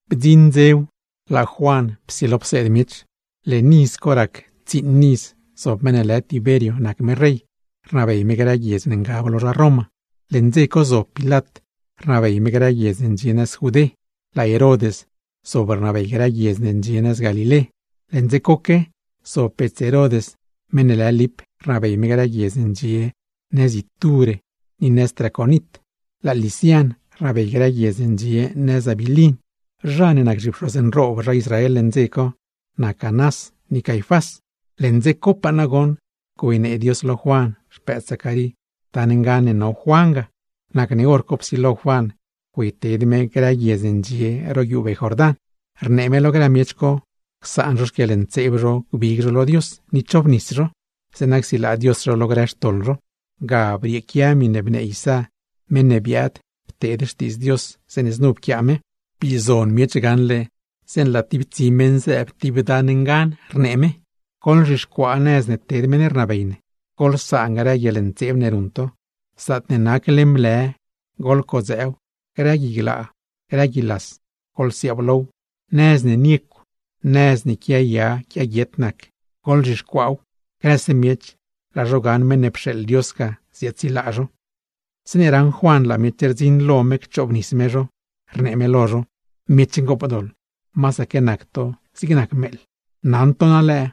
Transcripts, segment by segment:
Bdziṉ dzew, laa Juan psilo pseed miech. Lëë leṉ iz co rac tsiiṉ iz zob meṉ ne lë Tiber nac me rey, rnabey me grë guiedz ne ngab lo zha Roma. Leṉ dze co zob Pilat rnabey me grë guiedz ne ndxie nëz Judé, laa Herod zob rnabey grë guiedz ne ndxie nëz Galilé. Leṉ dze coque zob bets Herod, meṉ ne lë Lip rnabey me grë guiedz ne ndxie nëz Ituré ni nëz Traconit; laa Lisian rnabey grë guiedz ne ndxie nëz Abilin. Zha ne nac zhipxoz nroob zha Israel leṉ dze co, nac Anás ni Caifás. Leṉ dze copaa nagoṉ güeynee Dios lo Juan (xpëëd Zacarí) dan ngan ne no Juan ga. Nacne hor co psilo Juan güeyted me grë guiedz ne ndxie ro guiubee Jordán, rnee me lo grë miech co, csaan zho xquieḻntseeb zho gbig zho lo Dios ni chobnis zho, zeeṉa csilaa Dios zho lo grë xtoḻ zho. Ga brieequia miṉe bnee Isá, meṉ ne biaad pteed xtiidz Dios, zeeṉe znu pquiaa me: Bii zon miech gaṉle zeeṉe laa tib tsi meṉ zëëb tib dan ngan, rnee me: “Goḻzhixcuaa nëz ne ted meṉ ne rnabey, goḻsaan grë guieḻntseeb ne ruṉ to. Zaatne nac leṉ blë, goḻcodzëëw, grë gui glaa, grë gui las, goḻsiaablow. Nëz ne niecw, nëz ne quiaya quiaguiet nac, goḻzhixcuaaw. Grëse miech, laa zho gaṉ meṉ ne pxeeḻ Dios ga ziaadsilaa zho.” Zeeṉe raṉ Juan laa miech rdziṉ lo me cchoobnis me zho, rnee me lo zho: ―¡Miech ngoopdoḻ, masaque nac to zig nac meeḻ! Naṉ to na lëë,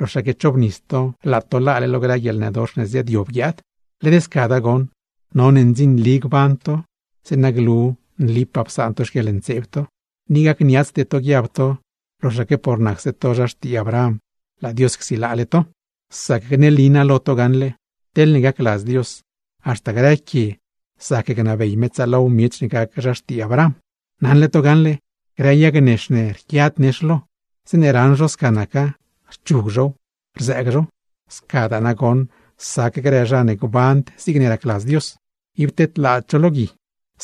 loxaque chobnis to laa to laale lo grë guieḻnëdox ne ziaadyob guiaad. Led scada goṉ, none ndzinli gban to zeeṉa glu nlipaa psaan to xquieḻntseeb to. Ni gacniatsde to guiab to, loxaque por nacse to zha xtii Abraham, laa Dios csilaale to; sac gneli naa lo to gaṉle, teḻne gacladz Dios, haxta grë quie zac gnabey me tsaalow miech ne gac zha xtii Abraham. Naṉle to gaṉle, grë yag nex ne rquiad nex lo, zeeṉe raṉ zho sca naca, rchug zhow, rzëëg zhow; scadaa nagoṉ sac grë zha ne gband zigne racladz Dios, ib tedlaad zho lo gui;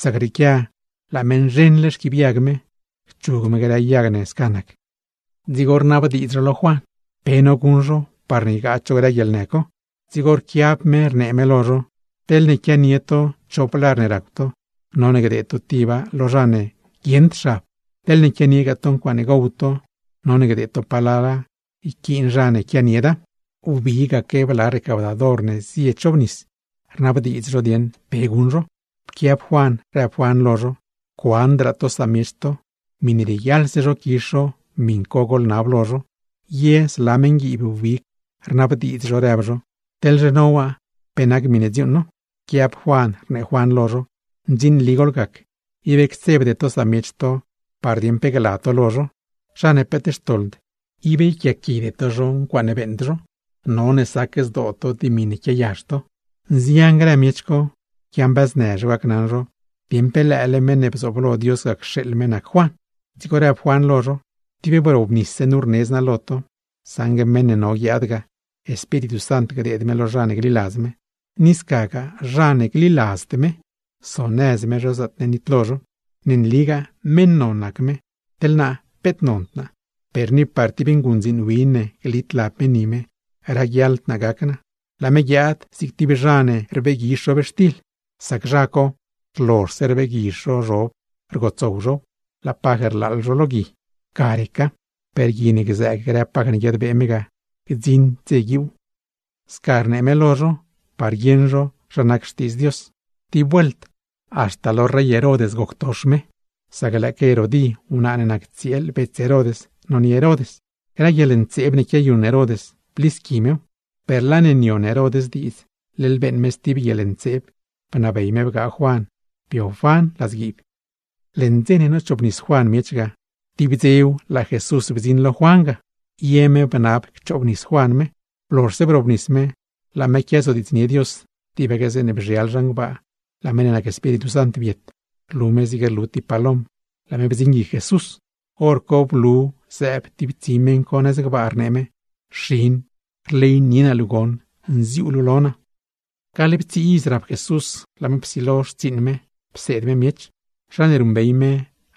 sac rrieequia laa me nzheṉle xquiibyag me, cchug me grë yag ne sca nac. Dzigo rnabdiidz zho lo Juan, pe no guṉ zho parne ygaad zho grë guieḻnë co. Dzigo rquiab me rnee me lo zho: ―Teḻne quianie to chop lar ne racw to, none gdeed to tiba lo zha ne guieṉd xab; teḻne quianiegaa to ncuaaṉe gow to, none gdeed to palala yquiin zha ne quianieda. Wbigaque bla recaudador ne zie chobnis, rnabdiidz zho dieṉ pe guṉ zho. Pquiab Juan, rëb Juan lo zho: ―Cuandraa to samiech to, miṉe rieguiaḻse zho quizh zho, miṉ co goḻnab lo zho. Ye zla meṉguiib wbig, rnabdiidz zho rëb zho: ―¿Teḻzhe no waa, pe nac miṉe dziuuṉ no? Rquiab Juan rnee Juan lo zho: ―Ndzinli goḻgac, ib ctsebde to samiech to par dieṉ pe gla to lo zho; zha ne peet xtoḻd, ib yquiaaquide to zho ncuaaṉe beeṉd zho. None sac zdoo to dimi ne quiayazh to. Nzian grë miech co quiambëznë zho gacnaṉ zho dieṉ pe lëële Meṉ ne bzooblo Dios ga cxeeḻ me nac Juan. Dzigo rëb Juan lo zho: ―Tib wrobnisse nu rnedz naa lo to, saṉgue meṉ ne no guiaad ga Espíritu Sant gdeed me lo zha ne gliladz me; ni scagaa zha ne gliladzd me, sonëz me zho zaatne nitlo zho. Ne nligaa meṉ non nac me, teḻ naa peet nond naa, per ni par tib nguṉdziin ne glit lab me ni me, raguiaḻd naa gac naa. Laa me guiaad zig tib zha ne rbeeguizh zhobxtil, sac zha co, rlozhse rbeeguizh zho zhob rgotsow zhow, laa paj rlaaḻ zho lo gui, ga reca. Per gui ne gzëëg grë paj ne guiadbee me ga, gdziṉd dze guiuuw. Sca rnee me lo zho, par guieṉ zho zha nac Xtiidz Dios. Tib vuelt haxta lo rey Herod goctox me, sac lëëque Herodí, wnaa ne nac tsieel bets Herod nonie Herod; grë guieḻntseeb ne quiayuṉ Herod, blisqui mew. Per laa ne nion Herod diidz, leḻ beeṉ me stib guieḻntseeb, bnabey me bgaa Juan bio Juan ladzguiib. Leṉ dze ne nochoobnis Juan miech ga, tib dzew laa Jesús bdziṉ lo Juan ga, ye me bnab cchoobnis Juan me. Blozhse brobnis me, laa me quiazodiidznie Dios, tibaque zeeṉe bzhial zhan gbaa, laa meṉ ne nac Espíritu Sant biet, rlu me zig rlu tib palom, laa me bdziṉ guic Jesús, hor co blu zëëb tib tsi meṉ co nëz gbaa, rnee me: ―Xin, rleynie naa luu goṉ, nziuu luu lo naa. Gaḻptsii iz rap Jesús, laa me psilo xtsiiṉ me pseed me miech. Zha ne ruṉbey me,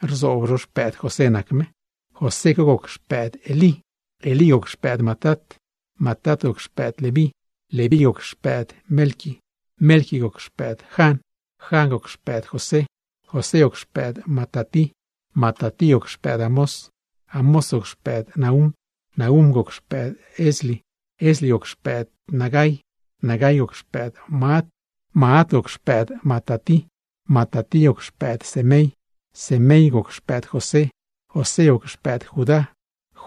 rzoob zho xpëëd José nac me, José co goc xpëëd Elí, Elí goc xpëëd Matat, Matat goc xpëëd Leví, Leví goc xpëëd Melqui, Melqui goc xpëëd Jan, Jan goc xpëëd José, José goc xpëëd Matatí, Matatí goc xpëëd Amós, Amós goc xpëëd Nahúm, Nahúm goc xpëëd Esli, Esli goc xpëëd Nagai, Nagai goc xpëëd Maat, Maat goc xpëëd Matatí, Matatí goc xpëëd Semei, Semei goc xpëëd José, José goc xpëëd Judá,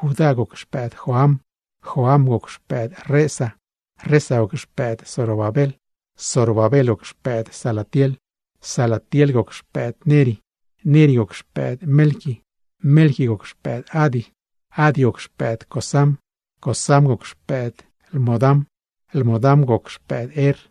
Judá goc xpëëd Joan, Joan goc xpëëd Resa, Resa goc xpëëd Zorobabel Zorobabel goc xpëëd Salatiel, Salatiel goc xpëëd Neri, Neri goc xpëëd Melqui, Melqui goc xpëëd Adi, Adi goc xpëëd Cosam, Cosam goc xpëëd Lmodam, Lmodam goc xpëëd Er,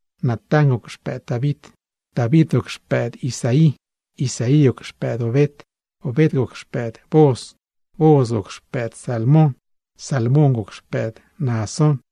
Natán goc xpëëd David, David goc xpëëd Isaí, Isaí goc xpëëd Obed, Obed goc xpëëd Booz, Booz goc xpëëd Salmon, Salmóngoc xpëëd Naasón,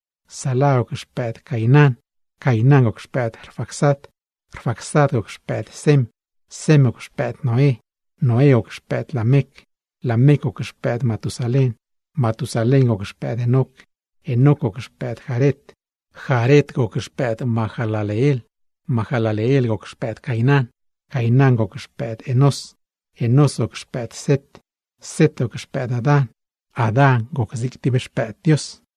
Sala goc xpëëd Cainán, Cainán goc xpëëd Rfaxad, Rfaxad goc xpëëd Sem, Sem goc xpëëd Noé, Noé goc xpëëd Lamec, Lamec goc xpëëd Matusalén, Matusalén goc xpëëd Enoc, Enoc goc xpëëd Jared Jared goc xpëëd Mahalaleel, Mahalaleel goc xpëëd Cainán, Cainán goc xpëëd Enós, Enós goc xpëëd Set, Set goc xpëëd Adán. Adán goc zig tib xpëëd Dios.